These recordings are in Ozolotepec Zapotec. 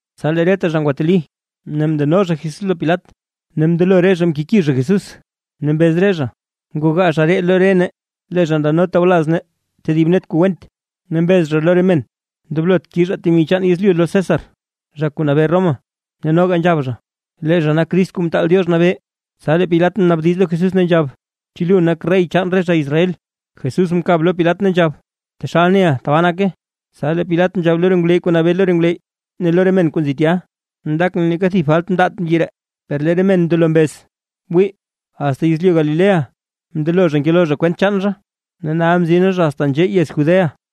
Tsa lee reta zha ngwateli ne mndeno zha Jesús lo Pilat. Ne mndelo re zha mkeki zha Jesús, ne mbez re zha: ―Ngogaa zha ree lo re nee, lee zha ndano tawlaz nee tedib net kuu went, ne mbez zha lo re men: “Ndoblot kizhaa temi chaan yezlyu lo César zha kuu nabee Roma”, ne noga nzhab zha: “Lee zha nak Crist Kuu Mtaal Diox Nabee”. Tsa lee Pilat mnaabdiz lo Jesús, ne nzhab: ―¿Chu lu nak rey chaan re zha Israel? Jesús mkab lo Pilat ne nzhab: ―Taxal neʼa, tabaa nake. Tsa lee Pilat nzhab lo re ngwleyy kuu nabee lo re ngwleyy ne lo re men kuu nzi tya: ―Ndakʼn neeka thib falt mndaat mbyi ree. Per lee re men ndelo mbez: ―Wii, asta yezlyu Galilea mndelo zha ngeloo zha kwent chaan zha, ne nal mzina zha asta nzhee yez Judea.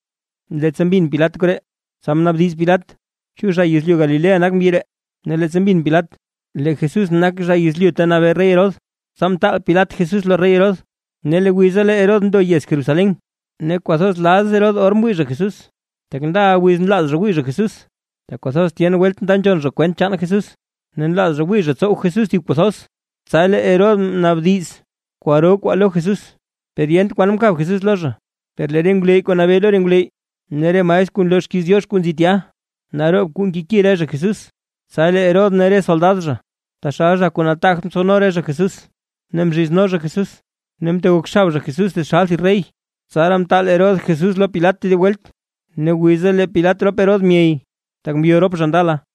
Leettsa mbin Pilat koree, tsa mnaabdiz Pilat: ―¿Chu zha yezlyu Galilea nak mbyi ree? Ne leettsa mbin Pilat lee Jesús nak zha yezlyu ta nabee rey Herodes, tsa mtaal Pilat Jesús lo rey Herodes. Ne lee wiza lee Herodes ndo yez Jerusalén. Ne kwathoz laz Herodes or mwii zha Jesús, tak ndaʼa wiz nlaaz zha wii zha Jesús, tak kwathoz tyen welt nda nzhon zha kwent chaan Jesús, ne nlaaz zha wii zha tsow Jesús thib kuu thoz. Tsa lee Herodes mnaabdiz kwaro kwaa lo Jesús, per yent kwan mkab Jesús lo zha. Per lee re ngwleyy kuu nabee lo re ngwleyy, ne re maestr kuu nloo xkiiz Diox kuu nzi tya, naroob kuu mkeki re zha Jesús. Tsa lee Herodes ne re soldad zha, taxal zha kuu nataagt mtsowno re zha Jesús ne mzhizno zha Jesús. Ne mtegok xab zha Jesús taxal thib rey. Tsaraa mtaal Herodes Jesús lo Pilat tedib welt. Ne wiza lee Pilat rop Herodes myey, tak mbyo rop zha ndala.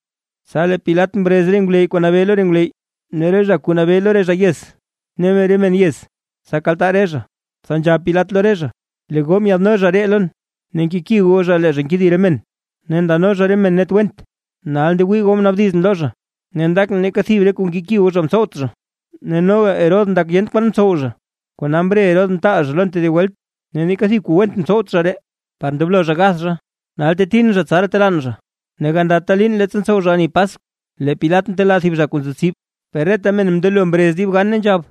Tsa lee Pilat mrez re ngwleyy kuu nabee lo re ngwleyy ne re zha kuu nabee lo re zha yez, ne re men yez, tsa kaltaa re zha. Tsa nzhab Pilat lo re zha: ―Lee goo myaadno zha ree lon, ne nkeki goo zha lee zha nkedi re men, ne ndano zha re men net went. Ne nal ngewii goo mnaabdizʼn lo zha, ne ndakʼn neeka thib re kuu nkeki goo zha mtsowt zha. Ne noga Herodes ndak yent kwan mtsow zha, kona mre Herodes mtaal zha lon tedib welt. Ne neeka thib kuu went mtsowt zha ree par ndoblo zha gath zha. Nal tetin zha, tsaraa telaan zha. Ne gandata liin leettsa ntsow zha ani Paskw, lee Pilat ntelaa thib zha kuu nzo tsib. Per reta men mndelo mrez dib gan, ne nzhab: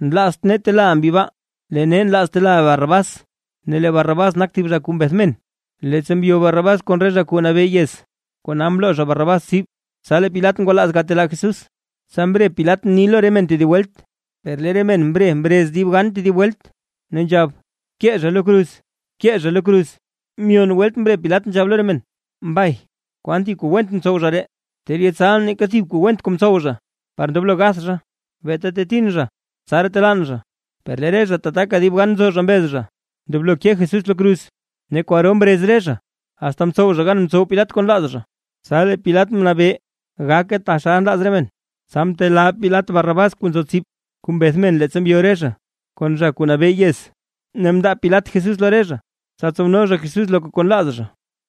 ―¡Nlaazt nee telaaʼa mbyi baa! ¡Lee nee nlaaz telaaʼa Barrabás! Ne lee Barrabás nak thib zha kuu mbeth men, leettsa mbyo Barrabás kon re zha kuu nabee yez, kona mloo zha Barrabás tsib. Tsa lee Pilat ngwalaaz gatelaa Jesús, tsa mre Pilat mni zha lo re men tedib welt. Per lee re men mre mrez dib gab tedib welt, ne nzhab: ―¡Bkee zha lo kruz, bkee zha lo kruz! Myon welt mre Pilat nzhab lo re men: ―Mbay, ¿kwan thib kuu went mtsow zha ree? Ter yetsalʼn neeka thib kuu went kuu mtsow zha par ndoblo gath zha, beeta tetin zha, tsaraa telaan zha. Per lee re zha tataka dib gan nzo zha mbez zha; ndoblo ke Jesús lo kruz. Ne kwaro mrez re zha, asta mtsow zha gan mtsow Pilat kuu nlaaz zha. Tsa lee Pilat mnabee gake taxal nlaaz re men. Tsa mtelaa Pilat Barrabás kuu nzo tsib, kuu mbeth men leettsa mbyo re zha, kon zha kuu nabee yez, ne mndaa Pilat Jesús lo re zha, tsa tsowno zha Jesús loka kuu nlaaz zha.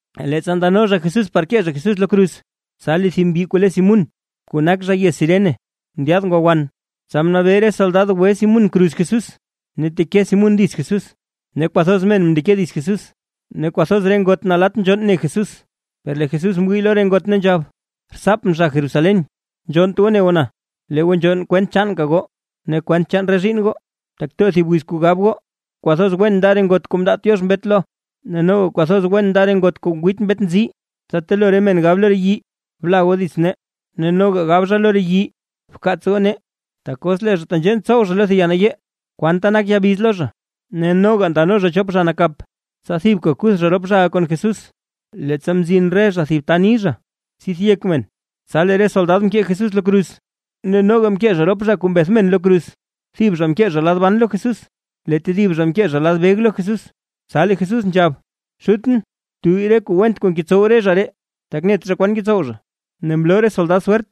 Leettsa ndano zha Jesús par kee zha Jesús lo kruz, tsa lee thib mbyi kuu le Simún kuu nak zha yez Cirene, ndyaad ngwa wan, tsa mnabee re soldad gwe Simún kruz Jesús ne teke Simún dits Jesús. Ne kwathoz men mndeke dits Jesús, ne kwathoz re ngot nalatt nzhonn ne Jesús. Per lee Jesús mwii lo re ngot ne nzhab: ―Rtsaapʼn zha Jerusalén, nzhonnt goo ne goo na, lee goo nzhonn kwent chaanka goo ne kwent chaan re zhiinn goo. Tak too thib wiz kuu gab goo: “Kwathoz wen nda re ngot kuu mndaat Diox mbet lo, ne noga kwathoz wen nda re ngot kuu ngwiit mbet nzii”. Tsa telo re men gab lo re yii: “Bla goo dits nee”. Ne noga gab zha lo re yii: “Bkaats goo nee”. Tak os lee zha tenzhee ntsow zha lo thib ya nayee, ¿kwanta nak ya biz lo zha? Ne noga ndano zha chop zha nakap, tsa thibka kuth zha rop zhaʼa kon Jesús. Leettsa mzin re zha thib ta ni zha “Tsith yek men”, tsa lee re soldad mkee Jesús lo kruz, ne noga mkee zha rop zha kuu mbeth men lo kruz, thib zha mkee zha lad ban lo Jesús lee tedib zha mkee zha lad beg lo Jesús. Tsa lee Jesús nzhab: ―Xutʼn, btuyy re kuu went kuu ngetsow re zha ree, tak net zha naa kwan ngetsow zha. Ne mloo re soldad swert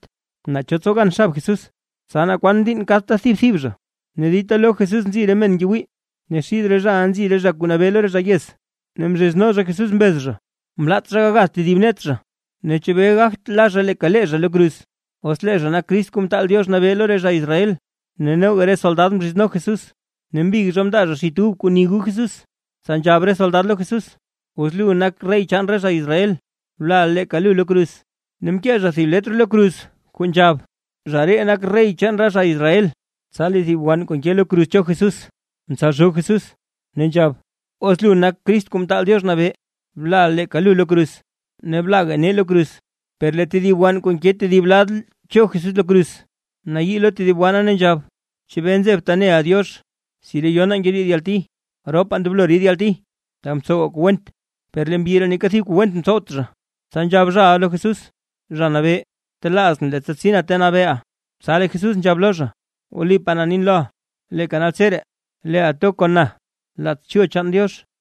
naa cho tsow gan xab Jesús, tsa naa kwan diinn kadta thib thib zha. Ne dita lo Jesús nzi re men ngewii, ne xid re zhaʼa nzi re zha kuu nabee lo re zha yez, ne mzhizno zha Jesús, mbez zha: ―Mlaat zha gagath tedib net zha, ne chebee gagt la zha leeka lee zha lo kruz, os lee zha nak Crist Kuu Mtaal Diox Nabee lo re zha Israel. Ne noga re soldad mzhizno Jesús, ne mbig zha mndaa zha xit ub kuu ni gu Jesús. Tsa nzhab re soldad lo Jesús: ―Os lu nak rey chaan re zha Israel, blaʼa leeka lu lo kruz. Ne mkee zha thib letr lo kruz kuu nzhab: “ZHA REE NAK REY CHAAN RE ZHA ISRAEL”. Tsa lee thib wann kuu nke lo kruz cho Jesús, mtsalzhoo Jesús, ne nzhab: ―Os lu nak Crist Kuu Mtaal Diox Nabee, blaʼa leeka lu lo kruz, ne blaga nee lo kruz. Per lee tedib wann kuu nke tedib lad cho Jesús lo kruz, mnayii lo tedib wanna, ne nzhab: ―¿Chebee nzebta neʼa Diox? Si re yonaa ngeriid yalti. Ropaa ndoblo ridaa yalti tak mtsowaa kuu went, per lee mbyi ree neeka thib kuu went mtsowt zha. Tsa nzhab zhaʼa lo Jesús: ―Zha Nabee, btelaazʼn, leettsa tsina ta nabeeʼa. Tsa lee Jesús nzhab lo zha: ―Wlipaa na nin loʼa, leeka naltseree leeʼa to kon na laats chul chaan Diox.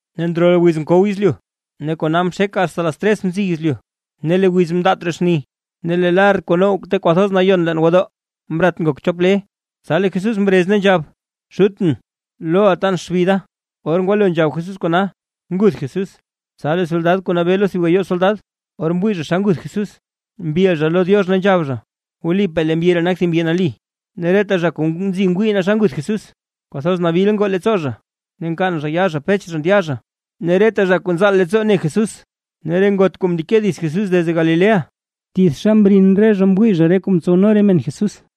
Ne ndrol wiz mkow yezlyu, ne kona mxek asta las tres mziy yezlyu. Ne lee wiz mndaat raa xni. Ne lee lar kuu now Ta Kwathoz Nayon leen gwodoo mrat ngok chop le. Tsa lee Jesús mrez ne nzhab: ―Xutʼn, loʼa tan xbi da. Or ngwalo nzhab Jesús kona, nguth Jesús. Tsa lee soldad kuu nabee lo thib gayoo soldad, or mwii zha xa nguth Jesús, mbil zha lo Diox, ne nzhab zha: ―Wlipaa lee mbyi ree nak thib mbyi nali. Ne reta zha kuu nzi ngwii naa xa nguth Jesús, kwathoz nabil ngoo leettsoo zha ne nkaan yaa zha pech zha ndya zha. Ne reta zha kuu nzaal leettsoo ne Jesús, ne re ngot kuu mndeke dits Jesús desde Galilea, tithxa mrin zha mwii zha re kuu mtsowno re men Jesús.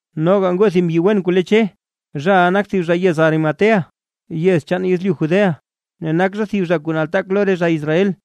Noga ngoo thib mbyi wen kuu le Che. Zhaʼa nak thib zha yez Arimatea yez chaan yezlyu Judea, ne nak zha thib re zha kuu nataak lo re zha Israel,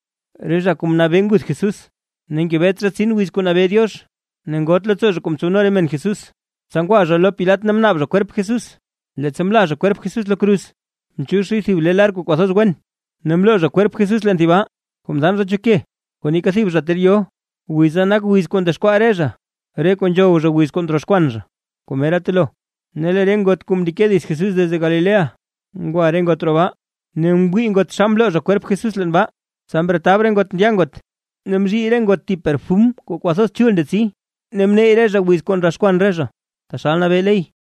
re zha kuu mnabee nguth Jesús. Ne ngebet zha tsin wiz kuu nabee Diox, ne ngoot leettsoo zha kuu mtsowno re men Jesús. Tsa ngwa zha lo Pilat ne mnaab zha kwerp Jesús. Leettsa mla zha kwerp Jesús lo kruz, mchiix zhay thib le lar kuu kwathoz wen, ne mloo zha kwerp Jesús leen thib baa kuu mdaan zha cho ke. Kuu neeka thib zha ter yo. Wiza nak wiz kuu ndexkwaa re zha re kuu nzhow zha wiz kuu ndroxkwan zha, kuu mera telo. Ne lee re ngot kuu mndeke dits Jesús desde Galilea, ngwa re ngot roo baa. Ne mwii ngot xa mloo zha kwerp Jesús leen baa. Tsa mretab re ngot ndya ngot, ne mzhii re ngot thib perfum kuu kwathoz chul ndetsi, ne mneyy re zha wiz kuu ndroxkwan re zha, taxal nabee ley.